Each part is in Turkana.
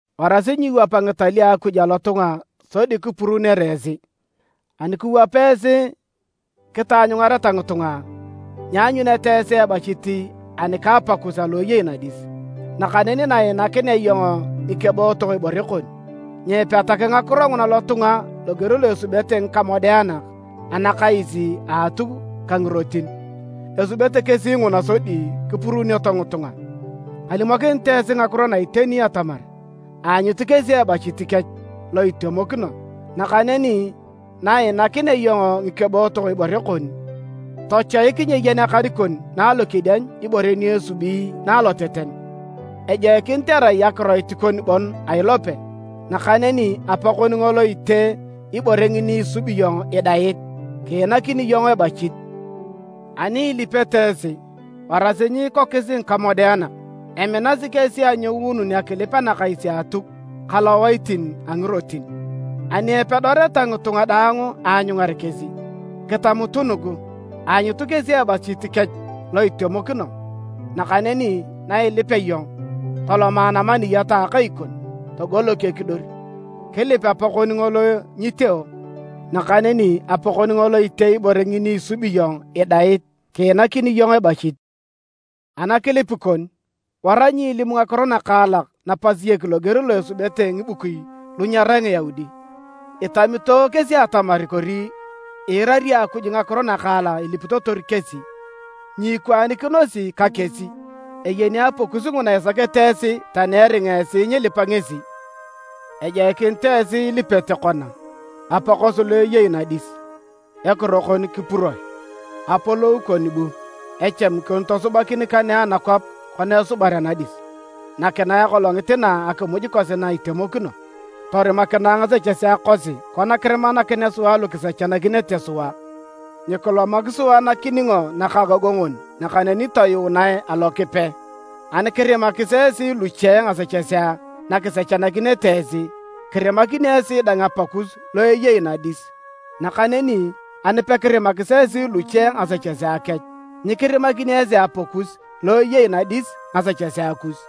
“Warasi nyiiwap ngitalio a Akuj alotunga sodi kipuruunere esi. Ani kiwap esi kitaanyungareta ngitunga, nyianyunete esi ebachit ani ka Apakus alo eyei nadis. “Nakaneni na iinakinea iyong ngikebootok ibore kon, nyiipetak ngakiro nguna lotunga loger lo esubete ngikamodeanak anakais a Atuk ka ngirotin. Esubete kesi nguna sodi kipuruunioto ngitunga. Kalimokinit esi ngakiro na iteni atamar, aanyut kesi ebachit kech lo itemokino. Nakaneni na iinakinea iyong ngikebootok ibore kon, tochoik nyeeyen akan na alokedieny ibore ni esubi na aloteten. Ejoikinit erai akiroit kon bon a ilope. Nakaneni Apa kon ngolo itee ibore ngini isubi iyong idait, kiinakini iyong ebachit. “Ani ilipete esi, warasi nyiikokis ngikamodeanak. Eminasi kesi anyounun akilip anakais a Atuk ka lowaitin a ngirotin, ni epedoreta ngitunga daang aanyungar kesi. Kitamutu nugu, aanyut kesi ebachit kech lo itemokino. Nakaneni na ilipea iyong, toloma namaniyat a akai kon togolok ekidor, kilip Apakon ngolo nyiteo. Nakaneni Apakon ngolo itee ibore ngini isubi iyong idait, kiinakini iyong ebachit. “Anakilip kon, wara nyiilimu ngakiro nakaalak napasiek loger lo esubete Ngibukui lu nyerai Ngiyaudi. Itamito kesi atamar kori iirari Akuj ngakiro nakaalak ilipitotor kesi. Nyiikwaanikinosi ka kesi. Eyeni Apakus nguna isakete esi tani eringa esi nyilipa ngesi. Ejoikinit esi ilipete kona: ‘Apa kosi lo eyei nadis: Ekiro kon kipuroe. Apolou kon bu. Echami kon tosubakin kanege anakwap kona esubar anadis. Nakinae akolongit na akimuj kosi na itemokino. Torimakinae ngasechesea kosi kona kirimanakinea sua lu kisechanakinete sua. Nyikilomak sua nakiningo nakaagongon, nakaneni toyuunae a Lokipe.’ “Ani kirimanakis esi luche ngasechesea na kisechanakinete esi, kirimakini esi dang Apakus lo eyei nadis. Nakaneni ani pekirimakis esi luche ngasechesea kech, nyikirimakini esi Apakus lo eyei nadis ngasechesea kus.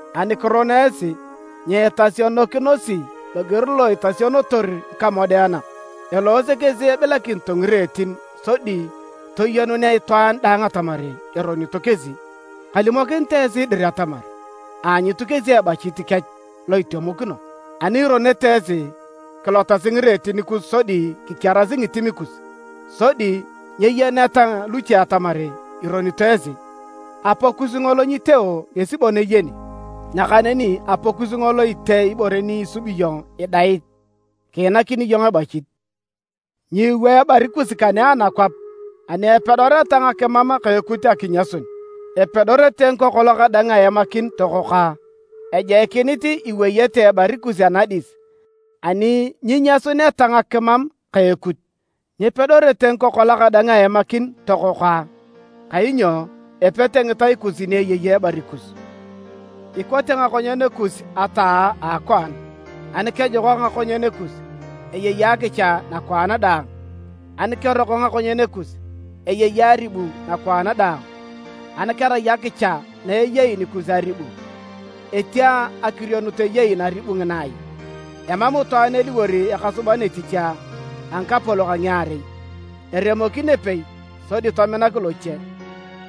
“Ani kiron esi, nyiitasionokinosi loger lo itasionotor ngikamodeanak. Eloose kesi ebilakinito ngireetin sodi toyenunea itwaan daang atamar eronito kesi. Kalimokinit esi dir atamar, aanyut kesi ebachit kech lo itemokino. Ani ironete esi, kilotasi ngireetin kus sodi kikiarasi ngitim kus. Sodi nyeyeneta luche atamar ironito esi. Apakus ngolo nyiteo ngesi bon eyeni. Nakaneni Apakus ngolo itee ibore ni isubi iyong idait, kiinakini iyong ebachit. “Nyiiwaa ebari kus kanege anakwap ani epedoreta ngakimam ka ekut akinyasun. Epedorete ngikokolak dang aemakin tokokoa. Ejoikinit iweyete ebari kus anadis ani nyinyasuneta ngakimam ka ekut. Nyepedorete ngikokolak dang aemakin tokokoa. Kainyo epete ngitai kus ni eyei ebari kus. “Ikote ngakonyen kus ataa a akwaan. Ani kejokak ngakonyen kus, eyei akicha nakwaan daang. Ani keroko ngakonyen kus, eyei aribu nakwaan daang. Ani kerai akicha na eyei nikus aribu, etia akirionut eyei naribu ngina ai? “Emam itwaan eliwor ekasuban etich a ngikapolok a ngiarei, eremokin epei sodi tominak loche,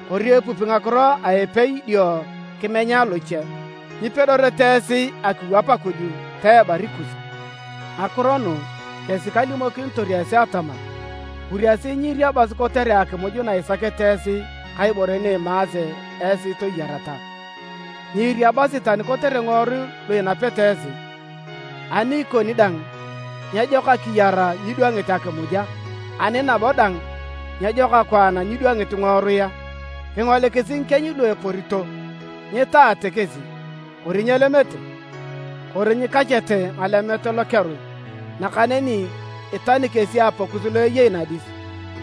kori epupi ngakiro a epei dio kimenya loche. Nyipedorete esi akiwap Akuj ta ebari kus. “Ngakiro nugu kesi kalimokinitor esi atamar, kuriasi nyiiriabasi kotere akimuj na isakete esi ka ibore ni imaase esi toyareta. Nyiiriabasi tani kotere ngiworui lu inapete esi. Ani ikoni dang, nyejok akiyar nyidwangit akimuj a? Ani nabo dang, nyejok akwaan nyidwangit ngiworui a? Kingolikisi ngikieny lu eporito. Nyitaate kesi, kori nyelemete, kori nyikachete ngalemet lokerui. Nakaneni itani kesi Apakus lo eyei nadis!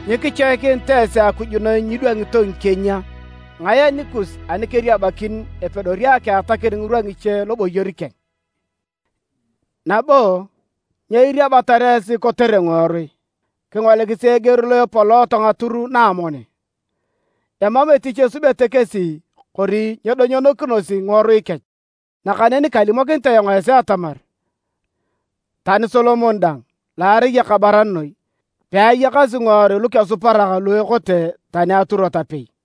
Nyikichoikinit esi Akuj noi nyidwangito ngikieny a? Ngae anikus ani keriabakin epedori akiatakin ngirwa ngiche loboyor keng? “Nabo, nyo iriabatar esi kotere ngiworui? Kingolikisi eger lo epolooto ngatur na amoni, emam etich esubete kesi kori nyedonyonokinosi ngiworui kech. Nakaneni kalimokinit ayong esi atamar, tani Solomon dang, lo arai ekabaran noi, peayakasi ngiworui lukesuparak lu ekote tani aturot apei.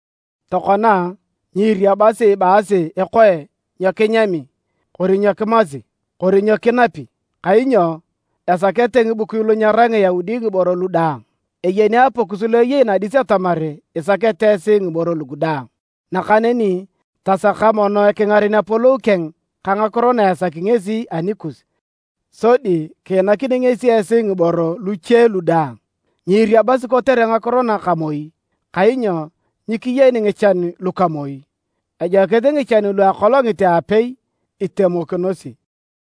“Tokona, nyiiriabasi ibaasi ekoe nyo kinyami, kori nyo kimasi, kori nyo kinapi. Kainyo esakete ngibukui lu nyerai Ngiyaudi ngiboro lu daang. Eyeni Apakus lo eyei nadis atamar isakete esi ngiboro lugu daang. Nakaneni tasaka mono ekingaren Apolou keng ka ngakiro na esaki ngesi anikus, sodi kiinakini ngesi esi ngiboro luche lu daang. Nyiiriabasi kotere ngakiro na ka moi, kainyo nyikiyeni ngichan luka moi. Ejoikinit ngichan lu a akolongit a apei itemokinosi.